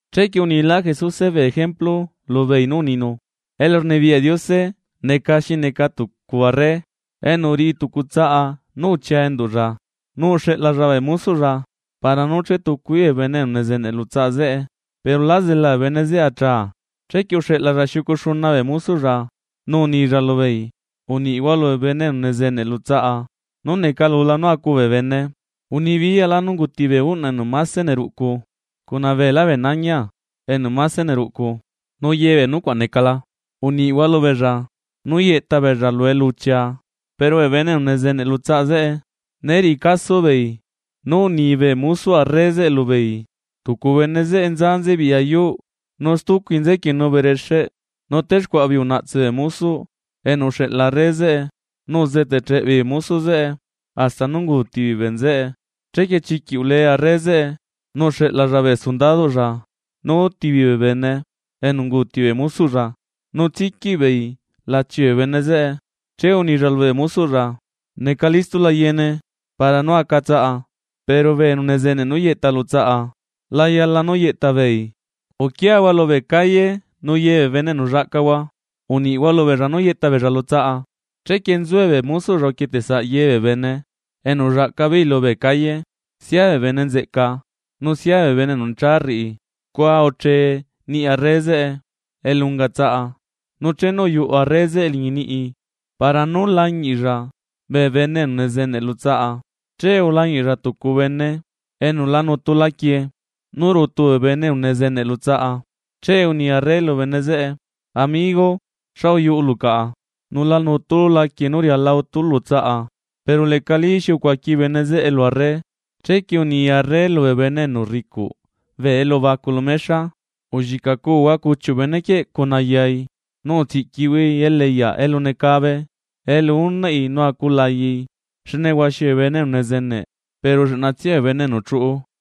Chequie unilá Jesuse bee ejemplu lubeei nú uninu: ―Elurnibiyaꞌ Diose neca xineca tucu arre enu uriꞌi tucu tsaꞌa nú uchia enduꞌlla. Nu uxeꞌlalla bee mosoꞌlla para nú chetucu beei bee bene enu nezeneꞌ lu tsaꞌa zeꞌe, pero lá zela bee bene zeꞌe achaa. Chequie uxeꞌlalla xiucu xuna bee mosoꞌlla, nu unilla lubeei: “Uniꞌhua lubee bene enu nezeneꞌ lu tsaꞌa nú necalula nú acu bee bene. Unibiyaꞌlá nú unguti bee uꞌnaꞌ enu mase neruꞌcu, cuna beelá bee nañia enu mase neruꞌcu, nu ye bee nucuaꞌ necala, uniꞌhua lubeella nú yeꞌta beella lu eluchia.” Pero bee bene enu nezeneꞌ lu tsaꞌa zeꞌe né riꞌi caso beei nú uni bee mosoꞌ arre zeꞌe lubeei. Tucu bene zeꞌe nza nzebiꞌya yuuꞌ, nu stucui nzequienu berexeꞌ, nu texcuaꞌa beei unaꞌtse bee mosoꞌ enu uxeꞌla arre zeꞌe, nu uzeteꞌcheꞌ beei bee mosoꞌ zeꞌe hasta nú unguuti beei bee nzeꞌe. Chequie chiquiꞌ ule arre zeꞌe, nu uxeꞌlalla bee sundadoꞌlla nú utibeei bee bene enu unguuti bee mosoꞌlla, nu tsiquiꞌ beei lachi bee bene zeꞌe. Che unilla lubee mosoꞌlla: “Neca listola yeene para nú aca tsaꞌa, pero bee enu uzeneꞌ nú yeꞌta lu tsaꞌa la yala nú yeꞌta beei. Uquiahua lubee calle nu ye bee bene enu llaꞌcahua uniꞌhua lubeella nú yeꞌta beella lu tsaꞌa.” Chequie nzue bee mosoꞌlla uquieteꞌsaꞌ ye bee bene enu ullaꞌca beei lubee calle, sia bee bene nzeꞌca nu sia bene enu necha rriꞌi, scua uche niꞌi arre zeꞌe elu unga tsaꞌa. ’Nu chenu uyuꞌu arre zeꞌe liñi niꞌi para nú lañiꞌlla bee bene enu nezeneꞌ lu tsaꞌa, che ulañiꞌlla tucu bene enu la nutu laquie nú rutu bene enu nezeneꞌ lu tsaꞌa. Che uni arre lu bene zeꞌe: “Amigo, ¿xa uyuꞌulu caꞌa, nu la nutulu laquie nú riala utulu lu tsaꞌa?” Pero lecalí xi ucuaqui bene zeꞌe lu arre. Chequie uni arre lubee bene enu rricuꞌ bee elubacu lu mexa: “Ulliꞌcaꞌcuhua cuchiuꞌ benequieꞌ cuna yai, nu utsiꞌquihuai eliꞌyaꞌ elu necabe, elu unaꞌi nu aculayai.” Xne huaxi bee bene enu nezeneꞌ, pero lleꞌnatsia bee bene enu chuꞌu.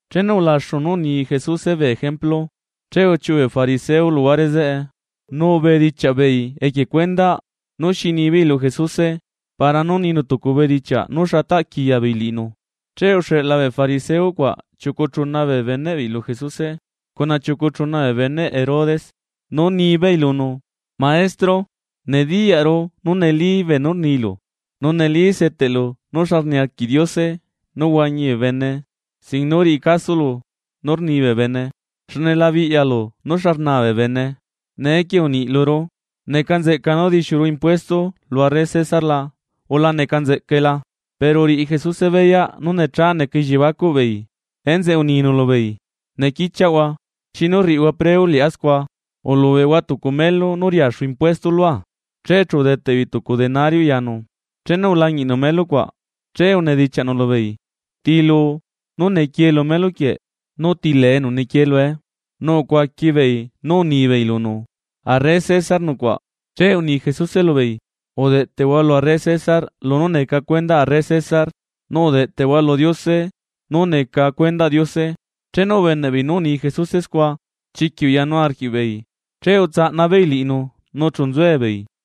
Chenu ulaxu nú uni Jesuse bee ejemplu. Che uchiuꞌu bee fariseo luhuare zeꞌe nu ubedichiaꞌ beei equie cuendaꞌ nú xi nibeei lu Jesuse, para nú ninu tucu bedichiaꞌ nu xa taꞌ quiya beei liꞌinu. Che uxeꞌla bee fariseo cuaꞌ chiucu chuna bee beneꞌ beei lu Jesuse, cuna chiucu chuna bee beneꞌ Herodes, nú nibeei lunu: ―Maestro, nediyaꞌru nú neli beenú rnilu nu neli seteꞌlu nú xa niarquiꞌ Diose nú huañi bee bene, sin nú riꞌi casolo nú rni bee bene, xne la biꞌyalu nú xa rnaa bee bene. Neequie uniꞌ luru: ¿Neca nzeꞌca nú dixiuru impuesto lu arre Cesar la, o la neca nzeꞌcae la? Pero uriꞌi Jesuse beyaꞌ nú necha neca elliebacuꞌ beei, enzeꞌe uninu lubeei: ―Nequichiaꞌhua, ¿xinu rriꞌihua preu liꞌá scua? Ulubeꞌhua tucu melu nú riaxu impuesto lua. Che chu udeteꞌ beei tucu denario yanu. Chenu ulañiꞌnu melu cuaꞌ, che unedichiaꞌnu lubeei: ―¿Tiluu nú nequie lu melu quieꞌ nu ti lee enu nequie lue? Nu ucuaqui beei nú unibeei lunu: ―Arre Cesar nucuaꞌ. Che uni Jesuse lubeei: ―Udeꞌtehua lu arre Cesar lunú neca cuendaꞌ arre César, nu udeꞌteꞌhua lu Diose nú neca cuendaꞌ Diose. Chenu ubeneꞌ beei nú uni Jesuse scua, chiquiꞌ uyanu arquiꞌbeei, che utsaꞌna beei liꞌinu nu chu nzuebeei.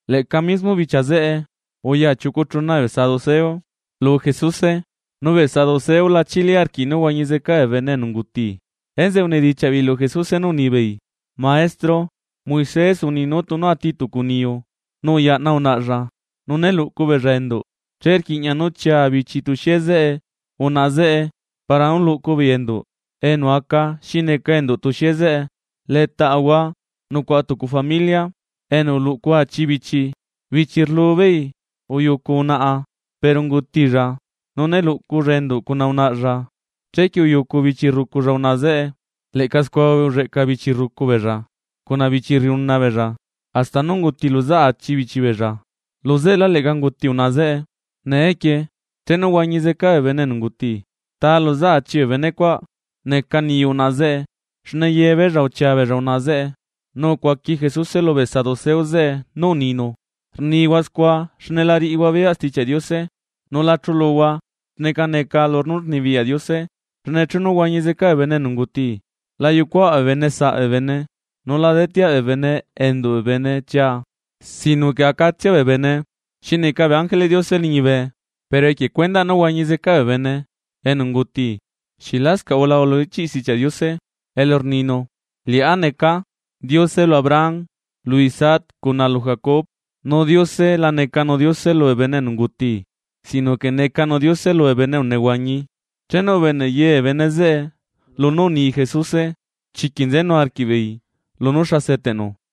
Leꞌca mismo bichia zeꞌe uya chiucu chuna bee saduceo lu Jesuse. Nu bee saduceo lachili arquiꞌ nu huañi zeca bee bene enu unguti. Enzeꞌe unedichiaꞌ beei lu Jesuse nú unibeei: ―Maestro, Moisés uni nú tunu ati tucu niyu nu uyaꞌna unaꞌlla nu né luꞌcu beella enduꞌ, che rquiꞌña nú chia bichi tuxie zeꞌe unaꞌa zeꞌe para nú luꞌcu beei enduꞌ enu aca xi neca enduꞌ tuxie zeꞌe. Letaꞌahua nucuaꞌa tucu familia enu uluꞌcu achi bichi. Bichi rlu beei uyucu unaꞌa pero ungutilla. Nu né luꞌculla enduꞌ cuna unaꞌalla, chequie uyucu bichi rruculla unaꞌa zeꞌe. Leꞌca scua ulleꞌca bichi rrucu beella, cuna bichi rriuna beella, hasta nú unguti luzaꞌ achi bichi beella. Luzeꞌelá, leꞌca unguti unaꞌa zeꞌe. Neequie, chenu huañi zeca bee bene enu unguti, ¿ta luzaꞌ achi bee bene cuaꞌ neca niyuꞌ unaꞌa zeꞌe, xne ye beella uchia beella unaꞌa zeꞌe? Nu ucuaqui Jesuse lubee saduceo zeꞌe nú uninu: ―Rnihua scua xne la riꞌihua beyaꞌ Stichiaꞌ Diose nu la chuluhua xneca neca lunú rnibiyaꞌ Diose. Xne chenu huañizeca bee bene enu unguti, la yucuaꞌ bee bene saꞌ bee bene, nu la deteaꞌ bee bene enduꞌ bee bene chia, sino que acatsia bee bene xi neca bee ángeleꞌ Diose liñibe. Pero equie cuendaꞌ nú huañi zeca bee bene enu unguti, ¿xieꞌ lascaꞌ ulahua lu ichiꞌ Stichiaꞌ Diose elu rninu? “Liꞌá neca Diose lu Abraham, lu Isaac cuna lu Jacob.” Nu Diose la necanu Diose lubee bene enu unguti, sino que necanu Diose lubee bene enu nehuañi. Chenu ubeneꞌ ye bee bene zeꞌe lunú uni Jesuse, chiquiꞌ nzenu arquiꞌbeei lunú xa seteꞌnu.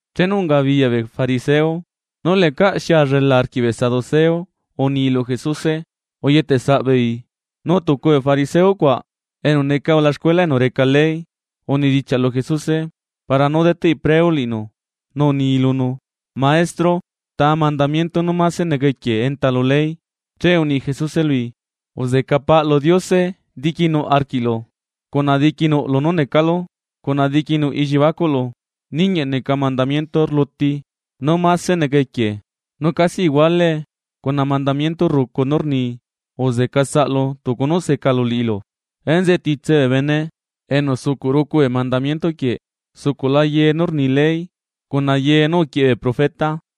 Chenu ungabiyaꞌ bee fariseo nú lecaꞌ xi allela arquiꞌ bee saduceo uni lu Jesuse, uyetesaꞌ beei. Nu tucu bee fariseo cuaꞌa enu neca ulaxcuela enu reca ley. Unedichiaꞌ lu Jesuse para nú deteꞌi preu liꞌinu, nu uni lunu: ―Maestro, ¿ta mandamiento nú mase neca equie enta lu ley? Che uni Jesuse lui: ―“Uzeca Paꞌlu Diose diquinuꞌ arquiꞌlu, cuna diqui lunú necalu cuna diqui nuꞌ elliebacuꞌlu.” Ninguieꞌ neca mandamiento rluti, nú mase neca equie. Nu casi iguaelee cuna mandamiento rrucu nú rni: “Uzeca saꞌlu tucu nú secalu liꞌilu.” Enzeꞌe titse bee bene enu sucuꞌ rucu bee mandamiento quieꞌ sucuꞌla nzeꞌe ye nú rni ley, cuna ye nú uquieꞌe bee profeta.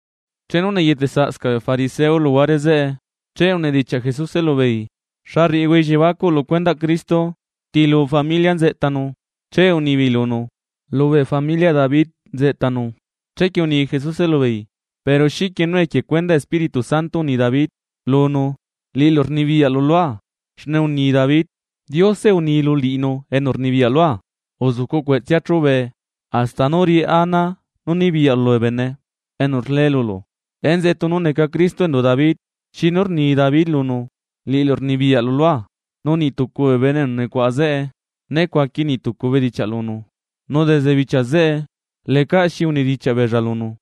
Chenu neyeteꞌsaꞌscaꞌ bee fariseo luhuare zeꞌe, che unedichiaꞌ Jesuse lubeei: ―¿Xa rriꞌihua elliebacuꞌ lu cuendaꞌ Cristo? ¿Ti lu familiaꞌ nzeꞌtanu? Che unibeei lunu: ―Lubee familiaꞌ David nzeꞌtanu. Chequie uni Jesuse lubeei: ―Pero, ¿xiquie nú equie cuendaꞌ Espíritu Santo uni David lunu, liꞌilu rnibiyaꞌlu lua? Xne uni David: Diose uni lu liꞌinu enu rnibiyaꞌ lua: “Uzucu cueꞌtsea chube, hasta nú riꞌá ana nibiyaꞌlu lubee bene enu rle lulu.” ¿Enzeꞌe tunu neca Cristo enduꞌ David, xinu rni David lunu, liꞌilu rnibiyaꞌlu lua? Nu niꞌ tucu bee bene enu nucuaꞌa zeꞌe né cuaqui niꞌ tucu bedichiaꞌ lunu, nu desde bichia zeꞌe lecaꞌ xi unedichiaꞌ beella lunu.